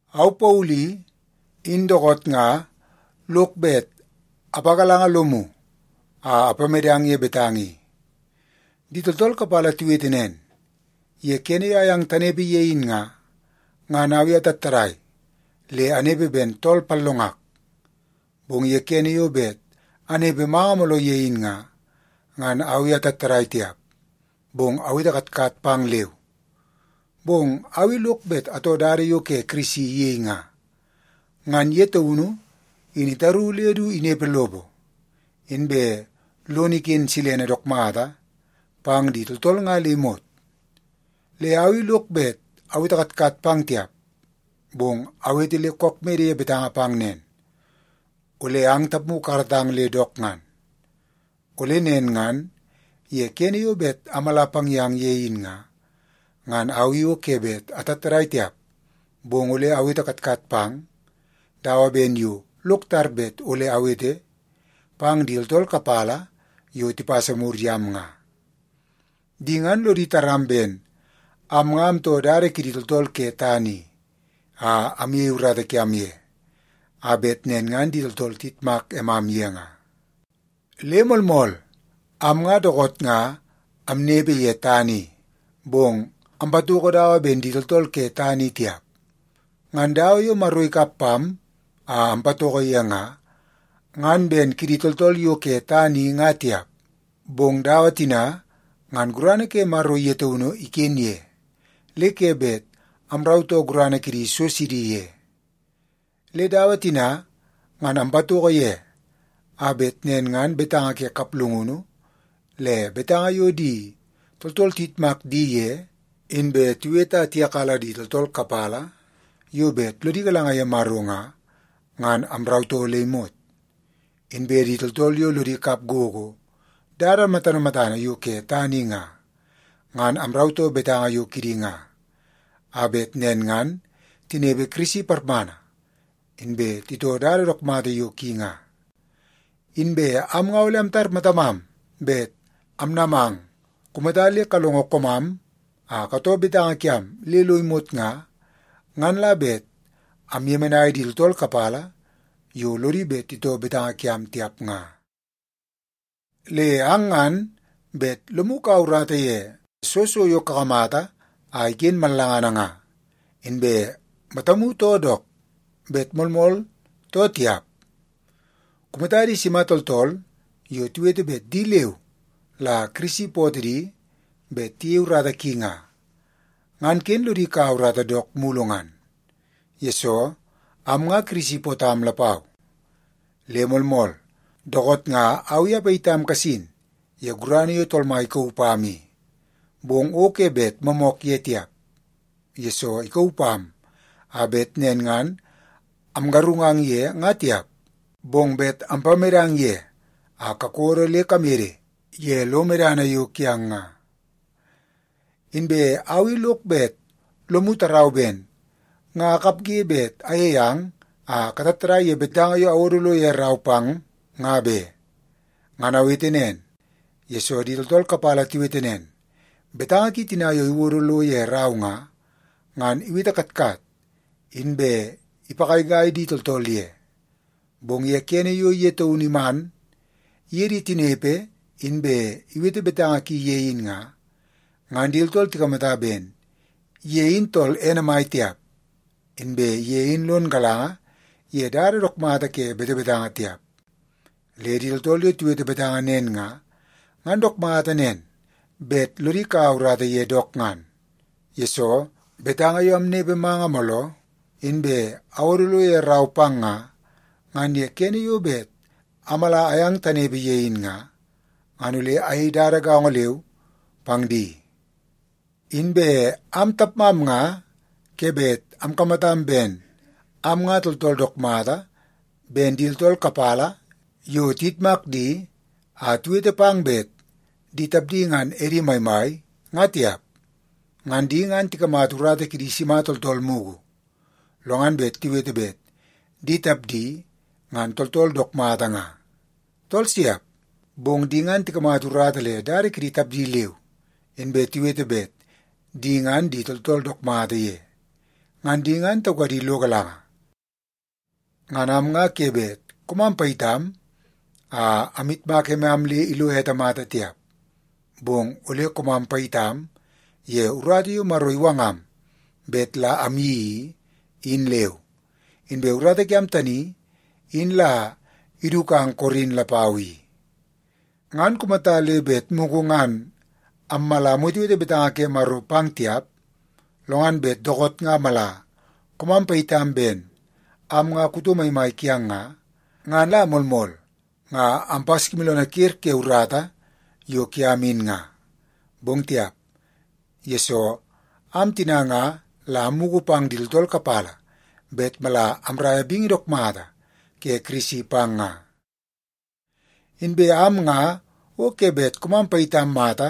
Au Paulu i, in dookoot nga lok bet apagalanga lomu a apamedang ye betanga i. Di tooltool kapala tiwete nen, ye kene yo ayang tanepe ye in nga, ngan au i atattadai le anepe ben tool pallongak, bong ye kene yo bet anepe manga mooloo ye in nga, ngan au i atattadai tiap, bong awete katkat pang leu. Bong au lok bet atoo dada yo Kirisi iyei nga, ngan ye taunu in itaru le du inepe lopo, inbe lono iken silene dook mata pang di tooltool nga le imot. Le au i lok bet awete katkat pang tiap, bong awete le kook mede ye betanga pang nen, ole ang tapmu kakaratang le dook ngan. Ole nen ngan ye kene yo bet amala pang yang ye in nga, ngan au i o ke bet atattadai tiap, bong ole awete katkat pang dawa ben yo lok tar bet ole awete pang di tooltool kapala yo tipasa mur yam nga. Di ngan lodi taram ben am nga amtoo dada kidi tooltool ke tana i a amyei urata kiam ye, a bet nen ngan di tooltool tiyitmak emam ye nga. Le moolmool, am nga dookoot nga amnepe ye tana i, bong ampatoko dawa ben di tooltool ke tana i tiap. Ngan dawa yo Maro ikap pam a ampatoko ye nga, ngan ben kidi tooltool yo ke tana i nga tiap. Bong dawa tina ngan gurana ke Maro ye taunu iken ye, le ke bet amrautoo gurana kidi so sidi ye. Le dawa tina, ngan ampatoko ye a bet nen ngan betanga ke kaplungunu, le betanga yo di tooltool tiyitmak di ye inbe tiwete a tiyakala di tooltool kapala yo bet lodi galanga ye Maro nga, ngan amrautoo le imot. Inbe di tooltool yo lodi kap gogo dada matana matana yo ke tana i nga, ngan amrautoo betanga yo kidi nga, a bet nen ngan tinepe Kirisi parmana, inbe titoo dada dook mata yo ki nga. Inbe am nga ole amtar matamam bet amnamang kumata le kalongo koomam a katoo betanga kiam le lo imot nga, ngan la bet amyemenai di tooltool kapala yo lodi bet titoo betanga kiam tiap nga. Le ang ngan bet lomu kaua urata ye soo so yo kakamata a iken mallangana nga, inbe matamu too dook bet moolmool too tiap. Kumata di sima tooltool yo tiwete bet di leu la Kirisi ipootoo di bet tiyei urata ki nga, ngan ken lodi kaua urata dook mulu ngan, yesoo am nga Kirisi ipootam lapau. Le moolmool, dookoot nga au i apayitam kasin ye gurana yo Tool Mai ikauu pam i. Bong o ke bet moomook ye tiap, yesoo ikauu pam a bet nen ngan amgarungang ye nga tiap, bong bet ampamedang ye a kakodo le kamede ye lo medana yo kiang nga. Inbe au i lok bet lomu tarau ben nga akapge bet ayei ang a katattadai ye betanga yo awodo lo ye rau pang nga be. Ngan awete nen, yesoo di tooltool kapala tiwete nen, “Betanga ki tina yo iwodo lo ye rau nga, ngan iwete katkat inbe ipagaigai di tooltool ye. Bong ye kene yo ye taunu iman iye di tinepe inbe iwete betanga ki ye in nga, ngan di tooltool tikamata ben ye in tool ene mai tiap, inbe ye in lon galanga ye dada dook mata ke betebetanga tiap.” Le di tooltool yo tiwete betanga nen nga, ngan dook mata nen bet lodi kaua urata ye dook ngan. Yesoo, betanga yo amnepe manga mooloo, inbe awodo lo ye rau pang nga, ngan ye kene yo bet ammala amyang tanepe ye in nga, ngan ole amyei dada gaongo leu pang di. Inbe am tapmam nga ke bet amkamatam ben am nga tooltool dook mata ben di tooltool kapala yo tiyitmak di a tiwete pang bet di tapdi ngan edi maimai, nga tiap. Ngan di ngan tikamata urata kidi sima tooltool mugu, lo ngan bet tiwete bet di tapdi ngan tooltool dook mata nga? Tool siap! Bong di ngan tikamata urata le dada kidi tapdi leu, inbe tiwete bet di ngan di tooltool dook mata ye. Ngan di ngan taukadi lo galanga. Ngan am nga ke bet koomam payitam a amyitmak emam le ilo ete mata tiap, bong ole koomam payitam ye urata yo Maro iwangam bet la amyeii i, in leu. Inbe urata kiam tani in la idukang Korin lapau i. Ngan kumata le bet mugu ngan ammala amwetewete betanga ke Maro pang tiap, lo ngan bet dookoot nga mala koomam payitam ben am nga kuto maimai kiang nga, ngan la moolmool nga ampaskimooloonoo ker ke urata yo kiam in nga. Bong tiap, yesoo am tina nga la ammugu pang di tooltool kapala bet mala amraia bingi dook mata ke Kirisi pang nga. Inbe am nga o ke bet koomam payitam mata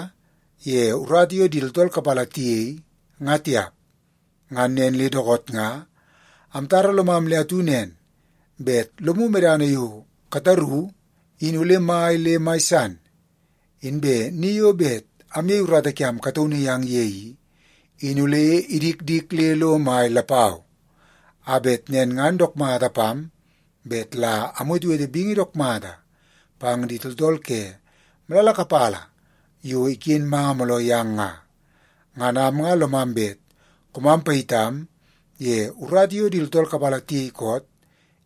ye urata yo di tooltool kapala tiyei nga tiap. Ngan nen le dookoot nga amtara lomam le atu nen bet lomu medana yo kataru in ole mai le mai san, inbe ni yo bet amyei urata kiam kataunu yang ye i, in ole idikdik le lo mai lapau, a bet nen ngan dook mata pam bet la amwetewete bingi dook mata pang di tooltool ke malala kapala yo iken manga mooloo yang nga. Ngan am nga lomam bet koomam payitam ye urata yo di tooltool kapala tiyei koot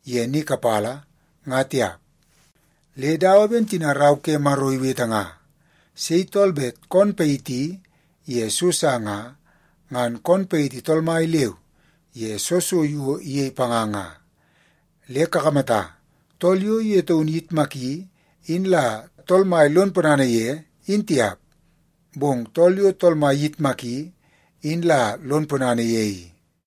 ye ni kapala, nga tiap. Le dawa ben tina Rau ke Maro iwete nga, “Sei tool bet koon payiti ye so sa nga, ngan koon payiti Tool Mai leu ye soo so yo iyei panga nga.” Le kakamata, tool yo ye taunu iyitmaki in la Tool Mai lon ponana ye, in tiap, bong tool yo Tool Mai iyitmaki in la lon ponana ye i.